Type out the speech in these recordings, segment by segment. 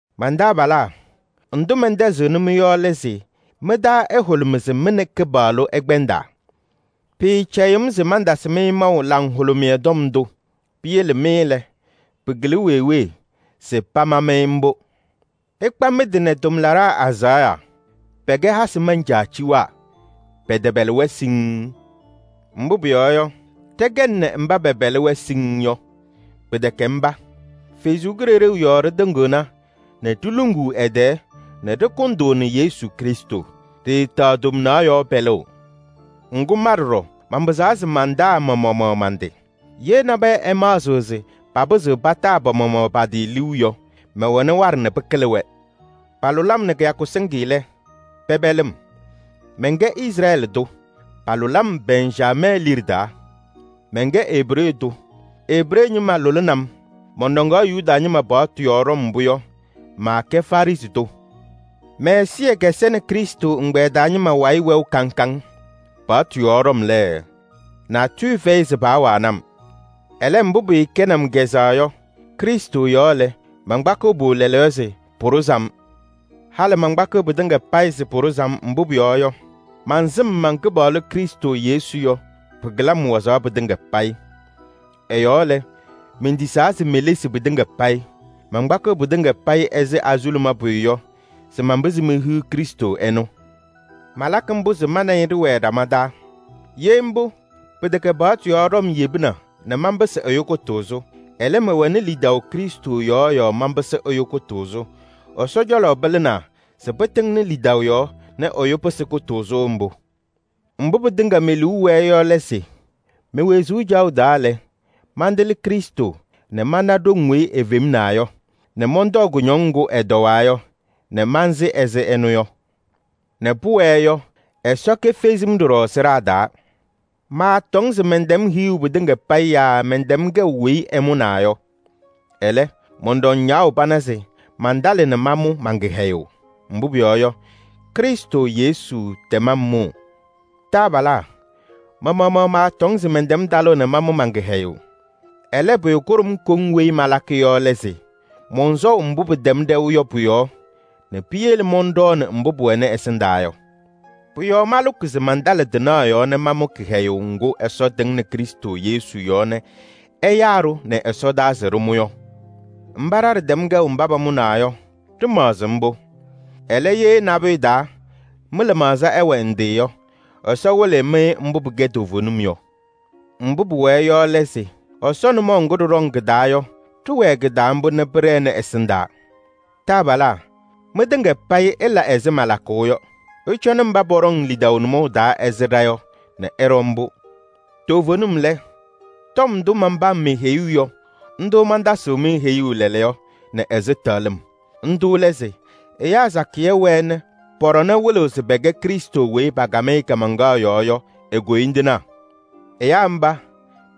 Man-taabalaa! Ndʋ mɛntɛzɩɣnɩ-mɩ yɔ lɛ se mɩ-taa ɛhʋlʋmɩ se mɩ nɛ Kɩpaɣlʋ ɩkpɛndaa. Pɩɩcɛyɩɣ-m se mantasɩ-mɩ maʋ Laŋhʋlʋmɩyɛ Tɔm ndʋ. Piyele mɩ lɛ, pɩkɩlɩ wee wee se pama-mɩ mbʋ. Ɩkpa mɩ-tɩ nɛ tʋmlaɖaa azaɣa, pɛkɛ hasɩ mancaaciwaa, pɛtɛpɛlɩ-wɛ siŋŋ. Mbʋ pʋyɔɔ yɔ, ɖɛkɛnɩ mba pɛpɛlɩ-wɛ siŋŋ yɔ, pɩtɛkɛ mba. Ɛsɔ Kalɩzaɣ yɔɔ ɖɩtɩŋɩɣna nɛ ɖiluŋuu ɛ-tɛɛ nɛ ɖɩkʋndʋʋnɩ Yesu Krɩstʋ. Ɖɩɩtaɣ tomnaɣ yɔɔ pɛlʋʋ. Ŋgʋ, ma ɖɔɖɔ manpɩzaɣ se mantaa ma-maɣmaɣ man-tɩ. Ye nabɛyɛ ɛmaɣzɩɣ se papɩzɩɣ pataa pa-maɣmaɣ pa-tɩ liu yɔ, mɛwɛnɩ waɖɛ nɛ pɩkɩlɩ-wɛ. Palʋlɩ-m nɛ kɩyakʋ sɩŋ lɛ, pɛpɛlɩ-m. Mɛnkɛ Izrɛɛlɩ tʋ, palʋlɩ-m Bɛnjamɛɛ liɖe taa. Mɛnkɛ Ebree tʋ, Ebree ñɩma lʋlɩnɩ-m. Mɔnɖɔŋaɣ Yuda ñɩma paɣtʋ yɔɔ ɖɔm mbʋ yɔ, maakɛ Farɩsɩ tʋ. Mɛ-ɛzɩyɛ kɛsɛnɩ Krɩstʋ ɛgbɛyɛ taa ñɩma wayɩ wɛʋ kaŋ kaŋ. Paɣtʋ yɔɔ ɖɔm lɛ, natʋyʋ fɛyɩ se paawanɩ-m. Ɛlɛ, mbʋ pɩɩkɛnɩ-m kazʋwa yɔ, Krɩstʋ yɔɔ lɛ, mankpakɩɣ-pʋ lɛɛlɛɛyɔ se pʋɖʋzɩ-m. Halɩ mankpakɩɣ pɩtɩŋa payɩ se pʋɖʋzɩ-m, mbʋ pʋyɔɔ yɔ, mansɩm man-Kɩpaɣlʋ Krɩstʋ Yesu yɔ, pɩkɩlɩ-m wazaɣ pɩtɩŋa payɩ. Ɛ-yɔɔ lɛ, mentisaa se melesi pɩtɩŋa payɩ. Mankpakɩɣ pɩtɩŋa ɛzɩ azuluma pʋyʋ yɔ se manpɩzɩ mehiɣ Krɩstʋ ɛnʋ. Malakɩ mbʋ se ma nɛ ɩ ɖɩwɛɛ ɖama taa. Ye mbʋ, pɩtɛkɛ paɣtʋ yɔɔ ɖɔm yebina nɛ manpɩsɩ ɛyʋ kʋtʋʋzʋ. Ɛlɛ, mɛwɛnɩ lidaʋ Krɩstʋ yɔɔ yɔɔ manpɩsɩ ɛyʋ kʋtʋʋzʋ. Ɛsɔ cɔlɔ pɩlɩnaa se pɩtɩŋnɩ lidaʋ yɔɔ nɛ ɛyʋ pɩsɩ kʋtʋʋzʋ mbʋ. Mbʋ pɩtɩŋa me-liu wɛɛ yɔ lɛ se: me-wezuu caɣʋ taa lɛ, mantɩlɩ Krɩstʋ nɛ mana ɖoŋ weyi efemnaa yɔ, nɛ mɔntɔɔ kʋñɔŋ ŋgʋ ɛtɔwaa yɔ nɛ mansɩ ɛzɩ ɛnʋ yɔ, nɛ pʋwɛɛ yɔ, Ɛsɔ kefezi-m ɖɔɖɔ sɩɖaa taa. Maatɔŋ se mɛntɛm hiɣu pɩtɩŋa payɩ yaa mɛntɛm kɛʋ weyi ɛmʋnaa yɔ. Ɛlɛ, mɔnɖɔŋ ñaɣʋ pana se mantalɩ nɛ mamʋ man-kɩhɛyʋʋ. Mbʋ pʋyɔɔ yɔ, Krɩstʋ Yesu tɛm-m mʋʋ. Taabalaa! Ma-maɣmaɣ maatɔŋ se mɛntɛm talʋʋ nɛ mamʋ man-kɩhɛyʋʋ. Ɛlɛ, pʋyʋ kʋɖʋm koŋ weyi malakɩ yɔ lɛ se: mɔnsɔʋ mbʋ pɩtɛm ɖɛʋ yɔ pʋ-yɔɔ nɛ piyele mɔnɖɔɔnɩ mbʋ pʋwɛnɩ ɛsɩndaa yɔ. Pʋ-yɔɔ malʋkɩ se mantalɩ tɩnaɣ yɔɔ nɛ mamʋ kɩhɛyʋʋ ŋgʋ Ɛsɔ tɩŋnɩ Krɩstʋ Yesu yɔɔ nɛ ɛyaa-ɖʋ nɛ ɛsɔdaa se ɖɩmʋ yɔ. Mba ɖa ɖɩtɛm kɛʋ mba pamʋnaa yɔ, ɖɩmaɣzɩ mbʋ. Ɛlɛ, ye nabʋyʋ taa mɩ-lɩmaɣza ɛwɛ ndɩ yɔ, Ɛsɔ wɩlɩɣ-mɩ mbʋ pɩkɛ toovenim yɔ. Mbʋ pʋwɛɛ yɔ lɛ se: Ɛsɔ nʋmɔʋ ŋgʋ ɖɩɖɔŋ kɩ-taa yɔ, ɖɩwɛɛ kɩ-taa mbʋ nɛ pɩɖɛnɩ ɛsɩndaa. Taabalaa! Mɩtɩŋa payɩ ɩla ɛzɩ malakʋʋ yɔ. Ɩcɔnɩ mba pɔɖɔŋ lidaʋ nʋmɔʋ taa ɛzɩ ɖa yɔ nɛ ɩɖɔ mbʋ. Toovenim lɛ, tɔm ndʋ manpam-mɩ heyuu yɔ, ndʋ mantasɩɣ-mɩ heyuu lɛɛlɛɛyɔ nɛ ɛzɩtɛɣlɩm. Ndʋ lɛ se: ɛyaa sakɩyɛ wɛɛ nɛ pɔ-ɖɔnɛ wɩlɩɣ se pɛkɛ Krɩstʋ weyi pakam-ɩ kaamaŋkaɣ yɔɔ yɔ e-koyindinaa. Ɛyaa mba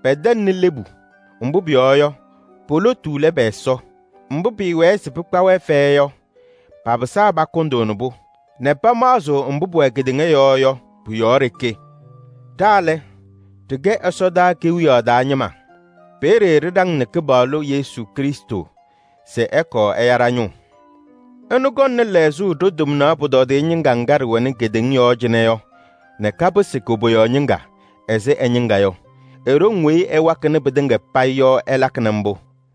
pɛtɛŋnɩ lebu, mbʋ pʋyɔɔ yɔ, po-lotu lɛ pɛ-Ɛsɔ. Mbʋ pɩɩwɛɛ se pɩkpa-wɛ fɛyɛ yɔ, papɩsaa pakʋndʋʋnɩ-pʋ nɛ pamaɣzɩɣ mbʋ pʋwɛ kedeŋa yɔɔ yɔ, pʋ-yɔɔ ɖeke. Ɖa lɛ, ɖɩkɛ ɛsɔdaa kewiyaɣ taa ñɩma. Peeye ɖɩɖaŋnɩ Kɩpaɣlʋ Yesu Krɩstʋ se ɛkɔɔ ɛya ɖa-ñʋʋ. Ɛnʋ kɔŋnɩ lɛɣzʋʋ ɖo-tomnaɣ pʋtɔdɩyɛ ñɩŋga ŋga ɖɩwɛnɩ kedeŋa yɔɔ cɩnɛ yɔ nɛ kapɩsɩ koboyaɣ ñɩŋga ɛzɩ ɛ-ñɩŋga yɔ. E-ɖoŋ weyi ɛwakɩnɩ pɩtɩŋa payɩ yɔ ɛlakɩnɩ mbʋ.